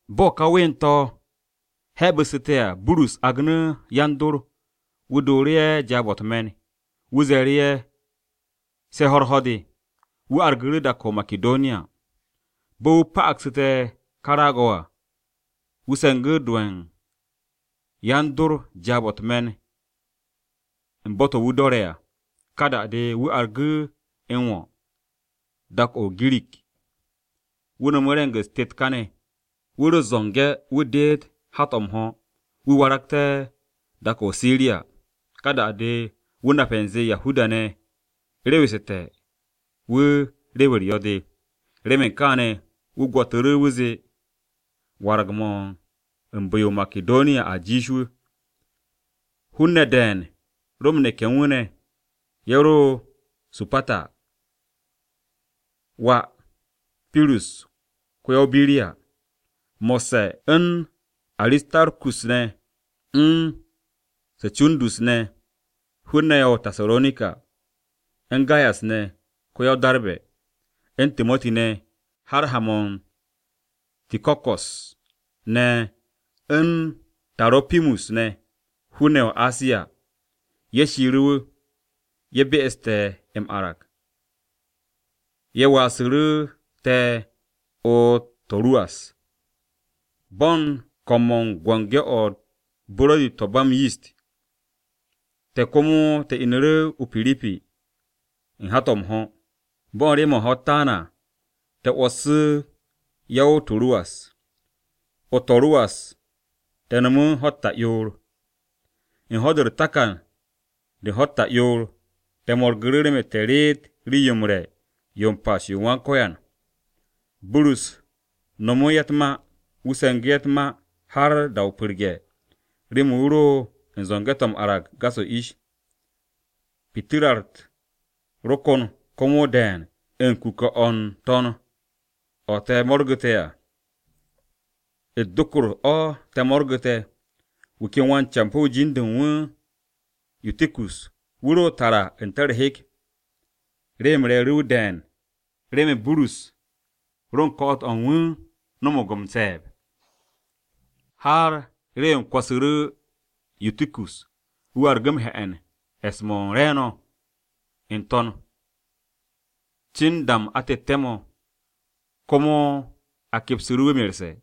Bo̱ ka ween-to̱ hebu̱ssu̱te̱ à, Burus agnu̱ yan-dor Ye̱so, wu̱ dooru̱ ye̱ jaab-o̱ u̱t-me̱n. Wu̱ ze̱e̱ru̱ ye̱ se̱ ho̱-u̱r ho̱r-de, wu̱ argu̱ru̱ dak-o̱ o-Makidoniya. Bo̱ wu̱ pa'agsu̱te̱ ka raag-o̱ à, wu̱ se̱ngu̱ do ye̱ u̱n yan-dor jaab-o̱ u̱t-me̱n u̱n bo̱-to̱ wu̱ do̱re̱ à. Ka da-de, wu̱ argu̱ m-wo̱ dak-o̱ o-Girik. Wu̱ no̱mu̱ re̱ng-u̱s tet kane̱. Wu̱ ro u̱t-zo̱nge̱ wu̱ deet hat-o̱ m-ho̱ wu̱ waragte̱ dak-o̱ o-Siriya. Ka da-de, wu̱ nape̱ u̱nze Yahuda-ne̱ rewesu̱te̱ wu̱ rew-u̱r yo̱-de. Remen kaane̱, wu̱ gwo̱tu̱ru̱ wu̱ zee warag-mo̱ u̱n bu̱-yo o-Makidoniya a jiish wu̱. Hun-ne̱ de̱e̱n ro m-neke̱ u̱n wu̱ ne̱. Ye̱ ro Supata (wà Pirus ko-ya-o-Biriya), mo̱sse̱ u̱n Aristarkus ne̱ u̱n Secundus ne̱ (hun-ne̱ ye̱ o-Tasaronika), u̱n Gayas ne̱ (ko-ya-o-Darbe̱), u̱n Timoti ne̱, har ma u̱n Tiko̱ko̱s ne̱ u̱n Taro̱pimus ne̱ (hun-ne̱ ye̱ o-Asiya), ye̱ shiiru̱ wu̱. Ye̱ be'estu̱ te̱ m-arag. Ye̱ waasu̱ru̱ te̱ o-To̱ruwas. Bo̱ u̱n ko̱m-mo̱ u̱n Biki-o̱ u̱t-Buro̱di to̱ ba m-Yist, te̱ komo te̱ inu̱ru̱ o-Piripi u̱n hat-o̱ m-ho̱. Bo̱ u̱n rew-mo̱ u̱n ho̱-u̱t taan, te̱ 'wo̱ssu̱ ye̱ o-To̱ruwas. O-To̱ruwas te̱ no̱mu̱ ho̱-u̱t ta'yoor. U̱n ho̱-de u̱r-takan de u̱n ho̱-u̱t ta'yoor, te̱ mo̱rgu̱ru̱ remen te̱ reet Rii-yo m-Re̱ yo m-Pas yo u̱n Wan-Ko̱yan. Burus nomo ye̱ u̱t-ma. Wu̱ se̱ngu̱ ye̱ u̱t-ma har da-o pu̱rge̱, remen wu̱ ro u̱n zo̱nge̱-to̱ m-arag gas-o̱ ish. Pitirra-u̱t ro kon komo de̱e̱n u̱n kuke̱-o̱ n-to̱n o̱ u̱t-dokor o̱ te̱ mo̱rgu̱te̱ à. Wu̱ ken wan-campo̱-wu̱ jin-de u̱n wu̱ Yutikus wu̱ ro tara n-te̱ u̱r-hek. Rew-m re̱e̱ru̱ wu̱ de̱e̱n remen Burus ro u̱n ko̱'o̱t-o̱ u̱n wu̱ no̱mo̱g m-se̱e̱b. Har rew-m kwo̱su̱ru̱ Yutikus, wu̱ argu̱ m-he̱'e̱n e̱s-mo̱ u̱n re̱e̱no̱ n-to̱n, cin u̱n da-m atette̱-mo̱. Komo a kepsu̱ru̱ wu̱ merse̱.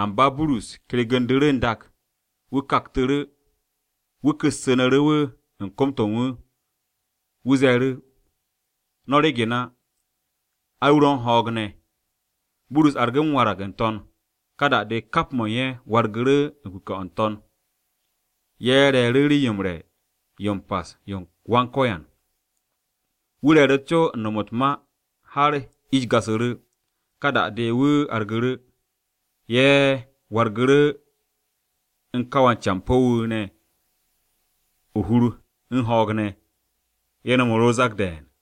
Amba Burus kergu̱ndu̱ru̱ n-dak, wu̱ kaktu̱ru̱, wu̱ ku̱u̱su̱nu̱ru̱ wu̱ u̱n kom-to̱ u̱n wu̱. Wu̱ ze̱e̱ru̱, “No̱ ryegen á, ai, wu̱ ro̱ u̱n ho̱o̱g ne̱.” Burus argu̱ m-warag n-to̱n. Ka da-de, kap mo̱ u̱n ye̱ wargu̱ru̱ u̱n kuke̱-o̱ n-to̱n. Ye̱ re̱e̱ru̱ Rii-yo m-Re̱ yo m-Pas yo u̱n Wan-Ko̱yan. Wu̱ re̱e̱ru̱ co u̱n nom u̱t-ma har ish gasu̱ru̱. Ka da-de ne̱, wu̱ argu̱ru̱. Ye̱ wargu̱ru̱ u̱n ka wan-campo̱-wu̱ ne̱ o-hur u̱n ho̱o̱g ne̱, ye̱ no̱mu̱ru̱ o-zak de̱e̱n.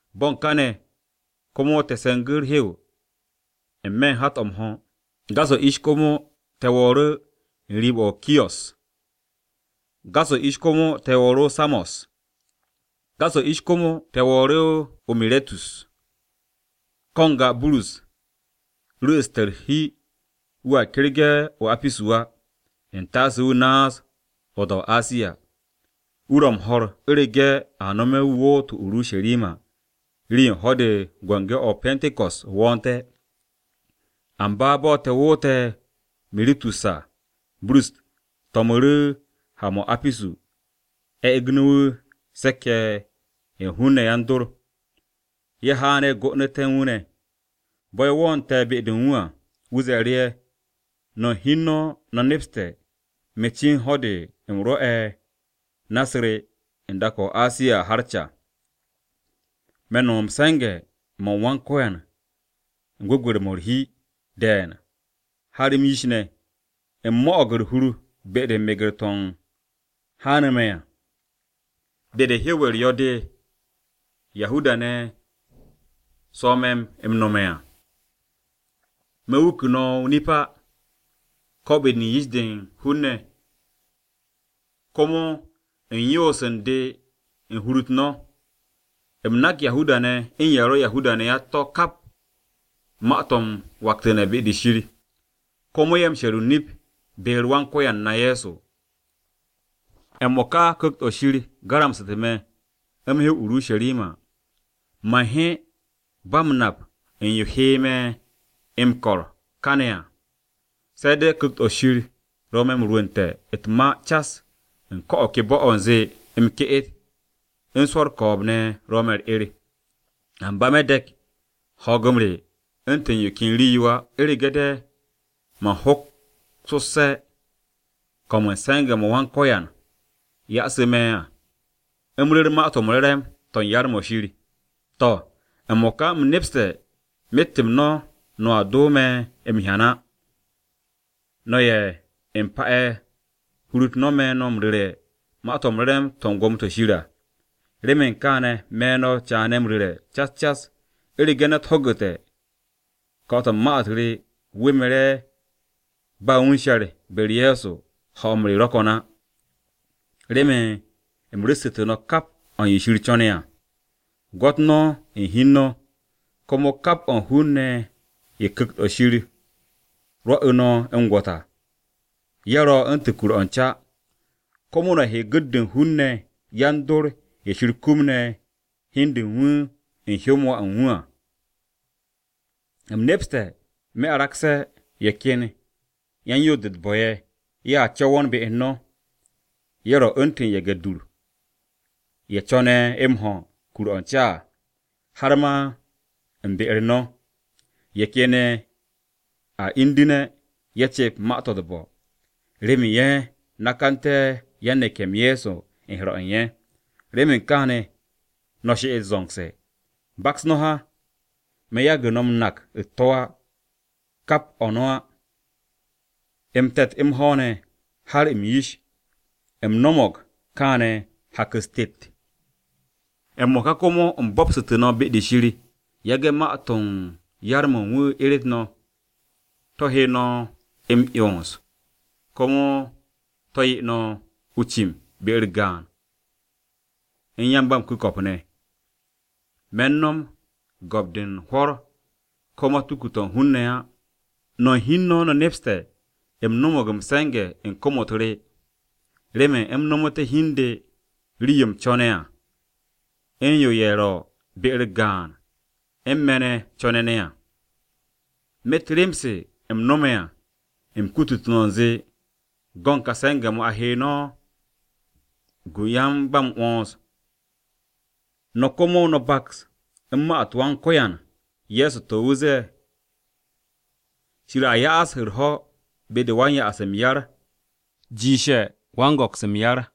Bo̱ u̱n kane̱ komo te̱ se̱ngu̱ u̱r-hew n-me̱ u̱n hat-o̱ m-ho̱. Gas-o̱ ish komo te̱ wo̱o̱ru̱ n-riib o̱ o-Kiyo̱s. Gas-o̱ ish komo te̱ wo̱o̱ru̱ o-Samo̱s. Gas-o̱ ish komo se̱ o-Miritus. Ko̱ n-ga Burus ru̱'u̱ste̱ u̱r-hi wu̱a kergu̱ne̱ o-Apisu á, u̱ntaase wu̱ naas o-da o-Asiya. Wu̱ ro m-ho̱r, u̱rege̱ a nome̱ wu̱ woot o-Urusharima rii-yo u̱n ho̱-de u̱n Biki-o̱ o-Pe̱nte̱ko̱s wo̱o̱nte̱. Amba bo̱ te̱ woote̱ o-Miritus à, Burus to̱mu̱ru̱ ha-mo̱ o-Apisu a e̱gnu̱ wu̱ se̱k-ye̱ ye̱ u̱n hun-ne̱ yan-dor. Ye̱ haan ye̱ go'onu̱te̱ u̱n wu̱ ne̱. Bo̱ ye̱ wo̱o̱nte̱ be-de u̱n wu̱ à, wu̱ ze̱e̱ru̱ ye̱, “No̱ u̱n hi u̱n no̱ no̱ nepste̱ me̱ cin ho̱-de u̱m rwo̱'e̱ na-u̱s re u̱n dak-o̱ o-Asiya à har ca. Me̱ m-no̱m u̱n se̱nge̱-m Wan-Ko̱yan u̱n gwu̱gwe̱r-mo̱ u̱r-hi de̱e̱n har m-yish ne̱. U̱m mo̱'o̱g u̱r-hur be-de u̱n meger-to̱ haanu̱ me̱ à be-de u̱n rew-u̱r yo̱-de de Yahuda-ne̱ swo̱ me̱ m-nome̱ à. Me̱ wuku no̱ o-nip á, ko̱ be-de yish-de u̱n hun-ne̱, komo u̱n yoos u̱n de u̱n hur-u̱t no̱. U̱m nak Yahuda-ne̱ u̱n ye̱ ro̱ Yahuda-ne̱ á u̱t-to̱ kap ma-to̱ m-waktu̱ne̱ be-de Shir, komo ye̱ m-she̱r o-nip be-u̱r Wan-Ko̱yan na Ye̱so. “M-mo̱ka Ku̱kt-o̱ Shir garamsu̱te̱ me̱, u̱m he o-Urusharima. Man he ba u̱n nap u̱n yo he me̱ u̱m ko̱r kane̱ à. Se̱ de̱ Ku̱kt-o̱ Shir ro̱ me̱ m-rwu̱nte̱ u̱t-ma cas u̱n ko̱ o̱ ke bo̱-o̱ u̱nze m-ke'et, u̱n swo̱ u̱r-ko̱o̱b ne̱ ro̱ me̱ u̱r-'er. Amba me̱ de̱k ho̱o̱g-m re u̱ntu̱n yo ken rii-yo á, u̱rege̱ de man hoksosse̱ ko̱m u̱n se̱nge̱-mo̱ Wan-Ko̱yan Ye̱so yasu̱ me̱ à, u̱m ru̱r Ma-to̱ m-Re̱re̱m to̱ u̱n yar-mo̱ Shir. “To̱, m-mo̱ka u̱m nepste̱ myet-m no̱ no̱a do me̱ m-hyan á, no̱ ye̱ u̱m pa'e̱ hur-u̱t no̱ me̱ no̱ m-ru̱re̱ Ma-to̱ m-Re̱re̱m to̱ u̱n Gwo̱mo-to̱ Shir à. Remen kaane̱ me̱ no̱ caane̱ m-ru̱re̱ cas cas, u̱rege̱ ne̱t ho̱gu̱te̱ ko̱'o̱t-o̱ u̱n ma-u̱t re wu̱ mere̱ ba wu̱ u̱n she̱r be-u̱r Ye̱so ho̱-m re ro̱ ko̱n á. Remen u̱m ru̱ssu̱tu̱ no̱ kap o̱ u̱n yo Shir co̱ne̱ à. Gwo̱t no̱ hi u̱n no̱, komo kap o̱ u̱n hun-ne̱ ye̱ Ku̱kt-o̱ Shir rwo̱'u̱ no̱ m-gwo̱t à. Ye̱ ro̱ u̱ntu̱n kur-o̱ u̱n ca. Komo no̱ he yan-gu̱t-de u̱n hun-ne̱ yan-dor ye̱ Shir kumne̱ hi u̱n de u̱n wu̱ u̱n hyó-m Wà u̱n wu̱ à. “U̱m nepste̱ me̱ aragse̱, ye̱ ken yan-yoos-de u̱t-bo̱ ye̱, ye̱a co̱wo̱n be u̱n no̱. Ye̱ ro̱ u̱ntu̱n ye̱ge̱-dur, ye̱ co̱ne̱ m-ho̱ kur-o̱ u̱n ca à. Har ma u̱n be-u̱r no̱, ye̱ ken ye̱a indu̱ne̱ ye̱ cep ma-to̱ u̱t-bo̱, remen ye̱ nakanté̱ yan-neke̱-m Ye̱so u̱n he̱r-o̱ u̱n ye̱. Remen kaane̱, no̱ she'et zo̱ngse̱. Baks no̱ ha, me̱ yagu̱ no̱ m-nak u̱t-to̱ kap-m no̱ á, m-te̱t m-ho̱w ne̱, har m-yish. U̱m no̱mo̱g kaane̱ hak-u̱s tet. “M-mo̱ka komo u̱m bo̱pstu̱ no̱ be-de Shir yage̱ ma-to̱ u̱n yar-mo̱ u̱n wu̱ eret no̱. To̱ he no̱ m-'yons, komo to̱ 'ye no̱ o-cim be-u̱r gaan u̱n yan-ba-m-ku̱ko̱p ne̱. Me̱ no̱m gwo̱p-de u̱n hwo̱r ko̱ matuku-to̱ u̱n hun-ne̱ á. No̱ u̱n hi u̱n no̱ no̱ nepste̱ u̱m no̱mo̱g m-se̱nge̱ u̱n kom-u̱t re remen u̱m nomoté̱ hi u̱n de rii-yo u̱m co̱ne̱ à u̱n yo ye̱ ro̱ be-u̱r gaan u̱n me̱ ne̱ ne̱ co̱ne̱ ne̱ à. Myet rem-se u̱m no̱me̱ à, u̱m kututú̱ no̱ u̱nze u̱n go̱n ká se̱nge̱-mo̱ a he no̱ gu u̱n yan-ba-m-'wo̱ns. No̱ komo m-baks u̱n ma-u̱t Wan-Ko̱yan Ye̱so, to̱ wu̱ zee, ‘Shir a ya'as u̱r-ho̱ be-de u̱n wan-ya'as m-yar, jiishe̱ wan-go̱ks m-yar.’”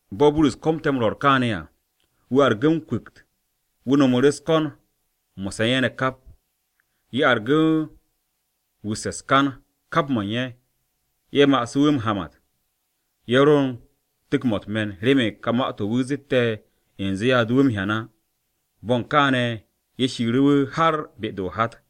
Bo̱ Burus komte̱ m-rwo̱r kaane̱ à, wu̱ argu̱ m-kwu̱kt, wu̱ no̱mu̱ru̱ u̱s-ko̱n mo̱sse̱ u̱n ye̱ ne̱ kap. Ye̱ argu̱ wusse̱ u̱s-kan kap mo̱ u̱n ye̱, ye̱ masu̱ wu̱ m-hamat. Ye̱ ro u̱n tu̱k-mo̱ u̱t-me̱n remen ka ma-to̱ wu̱ zette̱ u̱nze ye̱a do wu̱ m-hyan á. Bo̱ u̱n kane̱ ye̱ shiiru̱ wu̱ har be-de o-hat.